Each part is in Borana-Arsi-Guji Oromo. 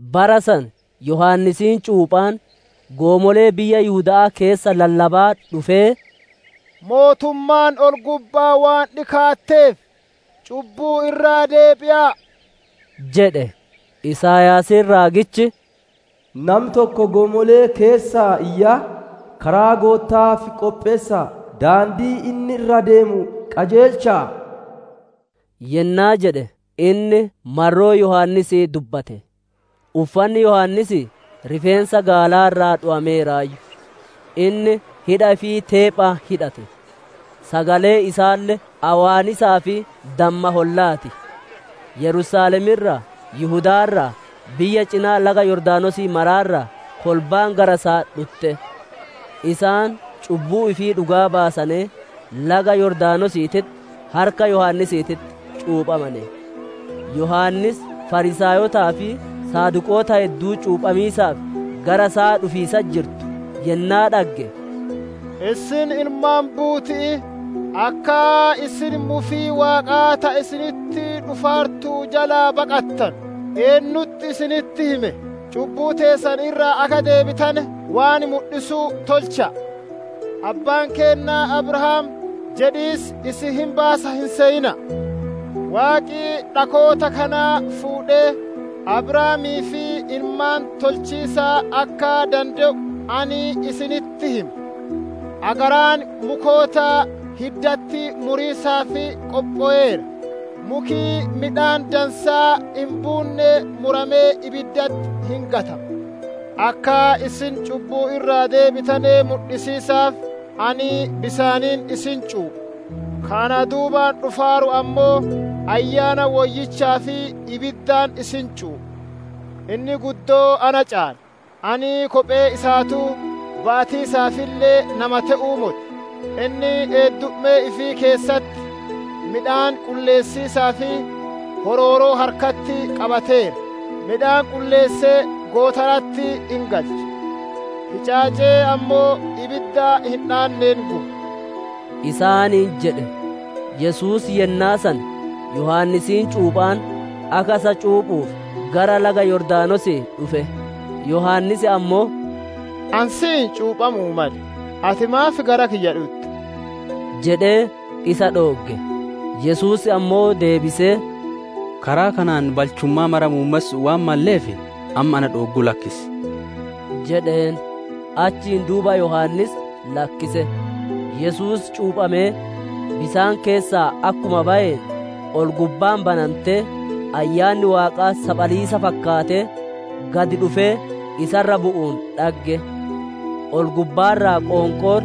Bara san Yohaannisiin cuuphaan goomolee biyya Yihuda'aa keessa lallabaa dhufee, «Mootummaan ol-gubba'aa waan dhikaatteef cubbuu irraa deebi'a'a!» jedhe. Isaayaasiin raagichi, «Nami tokko goomolee keessaa iyyaa, ‹Karaa Gootta'aaf qopheessa'a; daandii inni irra deemu qajeelcha'a!›» yennaa jedhe inni marroo Yohaannisii dubbate. Uffanni Yohaannisii rifeensa gaalaa irraa dhowameeraayyu; inni hidha ifii teephaan hidhate; sagaleen isaalle awwaannisaa fi damma hollaa ti. Yerusaalem irraa, Yihudaa irraa, biyya cinaa laga Yordaanosii mara irraa kolbaan gara isaa dhutte. Isaan cubbuu ifii dhugaa baasanee, laga Yordaanosiititti harka Yohaannisiititti cuuphamane. Yohaannis Fariisaayotaa fi Saduqoota hedduu cuuphamiisaaf gara isaa dhufiisatti jiranu yennaa dhagge, «Isin ilmaan buuti'ii! Akka isin mufii Waaqaa ta isinitti dhufaartu jalaa baqattanu eennutti isinitti hime? Cubbuu teessan irraa akka deebitane waan mudhisu tolcha'a. ‹Abbaan keenna Abrahaam› jedhiis isin hin baasa hin seyina'a. Waaqi dhakoota kana fuudhee Abrahaamiif ilmaan tolchiisa akka dande'u ani isinitti hima. Agaraan mukoota hiddatti muriisaaf qophoweera; muki midhaan dansaa hin buunne muramee ibiddatti hin gatama. Akka isin cubbuu irraa deebitane mudhisiisaaf ani bisaaniin isin cuupha, ka ana duubaan dhufaaru ammoo Ayyaana Woyyichaa fi ibiddaan isin cuupha. Inni guddoo na caala; ani kophee isaatuu ba'atiisaafille nama te'uu moti. Inni eeddummee ifii keessatti midhaan qulleessiisaaf horooroo harkatti qabateera; midhaan qulleessee gootara'atti hin galcha; hicaacee ammoo ibidda hin dhaanneen guba» isaaniin jedhe. Yesuus yennaa san Yohaannisiin cuuphaan akka isa cuuphuuf gara laga Yordaanosii dhufe. Yohaannis ammoo, «Ani si'iin cuuphamu'uu male, ati maaf gara kiyya dhutta?» jedhee isa dhoogge. Yesuus ammoo deebisee, «Karaa kanaan balchummaa mara muummessu'uu waan malleef, amma na dhoogguu lakkisi» jedheen; achiin duuba Yohaannis lakkise. Yesuus cuuphamee bisaan keessaa akkuma bayeen, ol-gubbaan banantee Ayyaanni Waaqaa saphaliisa fakkaatee gad dhufee isa irra bu'uun dhagge. Ol-gubbaa irraa qoonqoon,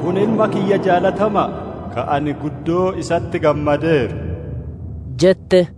«Kun Ilma kiyya jaalatama'a, ka ani guddoo isatti gammadeeru» jette.